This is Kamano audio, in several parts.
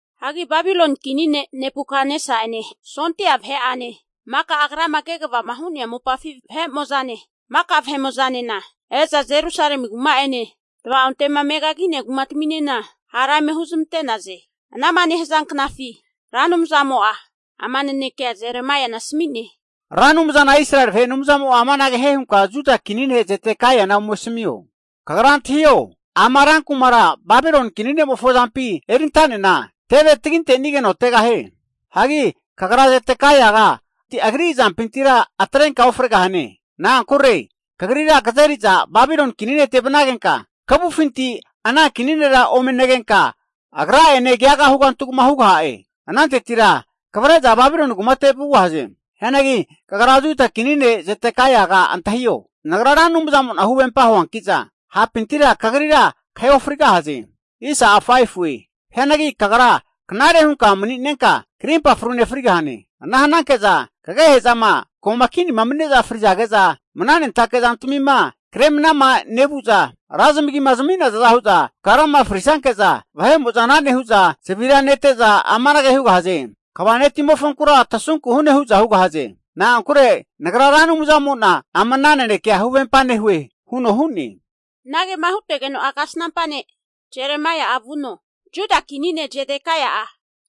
Hagi Babiloni kini ne' Nebukatnesa'ene sondia vahe'ane, maka agrama kegavama hu'nea mopafi vahe'mo'zane, maka vahe'mo'zanena e'za Jerusalemi kuma'ene, tva'onte'ma megagi'nea kumataminena hara eme huzamante'naze. Ana'ma nehaza knafi Ra Anumzamo'a ama nanekea Jeremaiana asami'ne. Ra Anumzana Israeli vahe Anumzamo'a amanage hie hunka Juda kini ne' Zedekaiana ome asamio. Kagra antahio! Ama rankumara Babiloni kini ne'mofo azampi erinta'nena teve taginte'nigeno tegahie. Hagi kagra Zedekaiaga agri azampintira atrenka ofregahane. Na'ankure kagrira kazeriza Babiloni kini nete vanagenka kavufinti ana kini nera ome negenka, agrane keaga hugantugama hugaha'e. Anantetira kavre'za Babiloni kumate vugahaze. Hianagi kagra Juda kini ne' Zedekaiaga antahio! Nagra Ra Anumzamo'na huvempa huanki'za, hapintira kagrira kahe ofrigahaze. Hianagi kagra knare hunka mani'nenka krimpa frune frigahane. Ana hananke'za kagehe'zama ko'ma kinima mani'neza frizage'za, mananentake zantamima kre manama nevu'za ra zamagima zami'nazaza hu'za, kagrama frisanke'za vahe'mo'za ana nehu'za, zavira nete'za amanage hugahaze. Kva ne'timofonkura tasunku hune hu'za hugahaze. Na'ankure Nagra Ra Anumzamo'na ama ana nanekea huvempa nehue huno hu'ne. Anagema hutegeno'a kasnampa ne' Jeremaia'a vuno, Juda kini ne' Zedekaia'a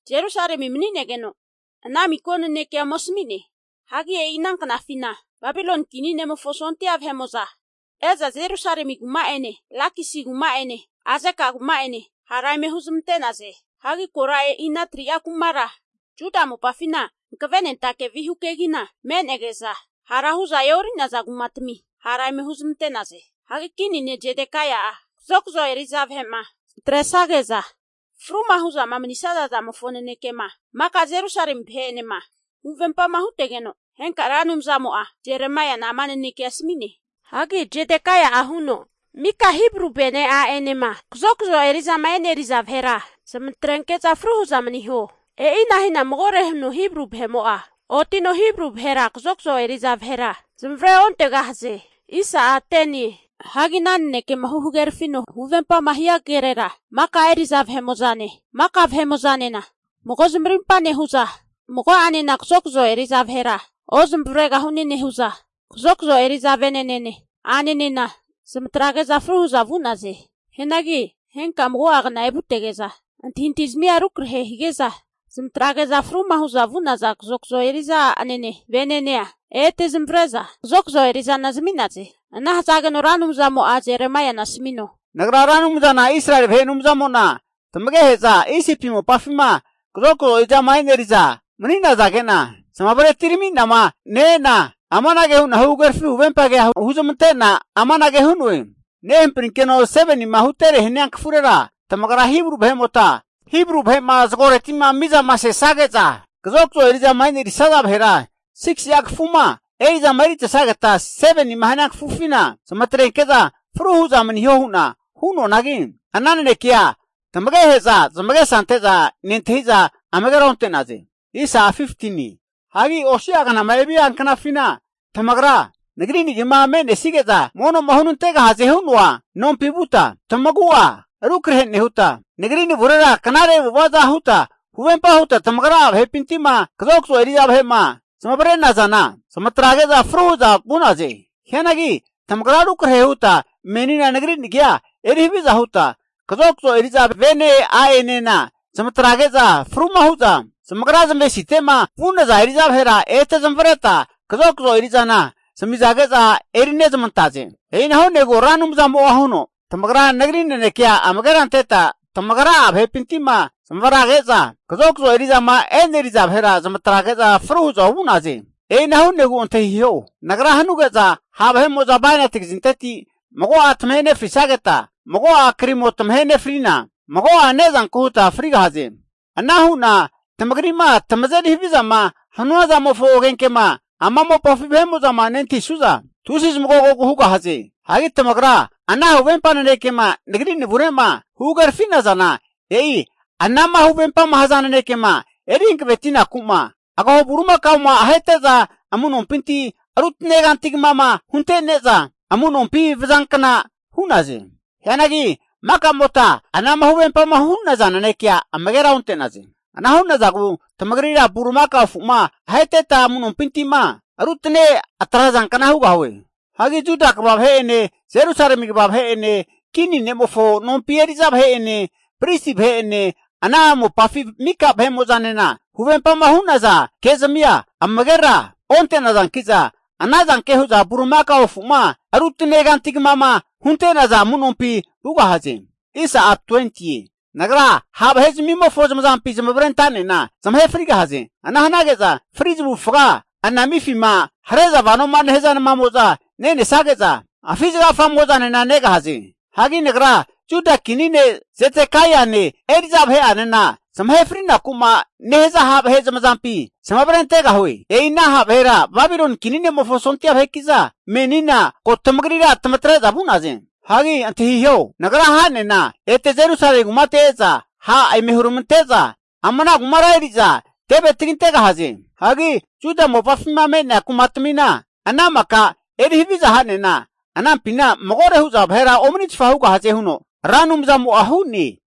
Jerusalemi mani'negeno ana miko nanekea ome asami'ne. Hagi e'i ana knafina Babiloni kini ne'mofo sondia vahe'mo'za e'za, Jerusalemi kuma'ene Lakisi kuma'enena Azeka kuma'ene hara eme huzamante'naze. Hagi kora e'i ana 3'a kumara Juda mopafina hankavenentake vihu kegina me'nege'za hara hu'za e'ori'naza kumatami hara eme huzmante'naze. Hagi Kini ne' Zedekaia'a kazokazo eri'za vahe'ma zamatresage'za fruma hu'za manisaza zamofo nanekema maka Jerusalemi vahe'enema huvempama hutegeno, henka Ra Anumzamo'a Jeremaiana ama nanekea asami'ne. Hagi Zedekaia'a huno, mika Hibru vene a'enema kazokazo eri'zama e'neriza vahera, zamatrenke'za fru hu'za maniho. E'ina hina magore huno Hibru vahe'mo'a, otino Hibru vahera kazokazo eri'za vahera zamavare ontegahaze. Hagi ana nanekema huhagerafino huvempama hia kerera maka eri'za vahe'mo'zane, maka vahe'mo'zanena mago zamarimpa nehu'za, mago'anena kazokazo eri'za vahera ozamavaregahune nehu'za kazokazo eri'za vene'nene a'nenena zamatrage'za fru hu'za vu'naze. Hianagi henka mago'a knama evutege'za, antahintahi zamia rukrahe hige'za zamatrage'za fruma hu'za vu'naza kazokazo eri'za a'ene venenea ete zamavare'za, kazokazo eri'zana zami'naze. Ana hazageno Ra Anumzamo'a Jeremaiana asamino, Nagra Ra Anumzana Israeli vahe Anumzamo'na, tamagehe'za Isipi mopafima kazokazo eri'zama e'neri'za mani'nage'na zamavare atirami'nama ne-e'na amanage hu'na huhagerafi huvempa kea huzmante'na amanage hu'noe, nehamprinkeno 7nima hutere hania kafurera tamagra Hibru vahe'mota, Hibru vahe'ma zagoreti'ma mizama sesage'za, kazokazo eri'zama erisaza vahera 6si'a kafuma eri'zama eritesageta 7nima hania kafufina zamatrenke'za fru hu'za maniho hu'na hu'noanagi, ana nanekea tamagehe'za zamagesa ante'za nentahiza amagera onte'naze. Hagi osi'a knama evia knafina tamagra, Nagri nagima me'nesige'za mono'ma hunantegahaze hu'noa mono nompi vuta, tamagu'a rukrahe nehuta, Nagri navurera knare avu'ava'za huta huvempa huta tamagra'a vahepinti'ma kazokazo eri'za vahe'ma zamavare'nazana zamatrage'za fru hu'za vu'naze. Hianagi tamagra rukrahe huta menina Nagri nagia eri haviza huta, kazokazo eri'za vene a'enena zamatrage'za fruma hu'za zamagra zamavesite'ma vu'naza eri'za vahera ete zamavareta kazokazo eri'zana zamige'za erinezamantaze. E'ina hu'negu Ra Anumzamo'a huno, tamagra Nagri nanekea amagera anteta tamagra'a vahepinti'ma zamavrage'za kazokazo eri'zama e'neriza vahera zamatrage'za fru hu'za ovu'naze. E'ina hu'negu antahiho! Nagra hanuge'za ha' vahe'mo'za bainati kazinteti mago'a tamahe nefrisageta, mago'a krimo tamahe nefrina, mago'a ne'zanku huta frigahaze. Ana hu'na tamagri'ma tamazeri havizama hanua zamofo agenkema ama mopafi vahe'mo'zama nentahi'suza, tusi zamagogogu hugahaze. Hagi tamagra ana huvempa nanekema Nagri navure'ma huhagerafi'nazana, e'i ana'ma huvempama haza nanekema eri hankavetinaku'ma, agaho bulimakaoma ahete'za amu'nompinti rutane kanti kamama huntene'za, amunompi vazankna hu'naze. Hianagi maka'mota ana'ma huvempama hu'naza nanekea amagera onte'naze. Ana hu'nazagu tamagrira bulimakao afu'ma aheteta amu'nompinti'ma rutane atrazankna hugahue. Hagi Juda kva vahe'ene, Jerusalemi kva vahe'ene, kini ne'mofo nompi eri'za vahe'ene, pristi vahe'ene, ana mopafi mika vahemo'zanena huvempama hu'naza ke'zamia amagera onte'nazanki'za, anazanke hu'za bulimakao afu'ma rutane kantigama hunte'naza amu'nompi vugahaze. Nagra ha' vahe'zamimofo zamazampi zamavare anta'nena zamahe frigahaze. Ana hanage'za fri zamavufaga anamifima hare'za vanoma nehaza namamo'za nenesage'za, afi zagagafamo'zanena negahaze. Hagi Nagra Juda kini ne' Zedekaiane eri'za vahe'anena, zamahe frinaku'ma nehaza ha' vahe zamazampi zamavare antegahue. E'i ana ha' vahera Babiloni kini ne'mofo sondia vaheki'za menina ko tamagrira tamatre'za vu'naze. Hagi antahiho! Nagra ha'nena ete Jerusalemi kumate e'za ha' eme huramante'za ama ana kumara eri'za teve tagintegahaze. Hagi Juda mopafima me'nea kumatamina ana maka eri haviza ha'nena anampina magore hu'za vahera omanitfa hugahaze huno Ra Anumzamo'a hu'ne.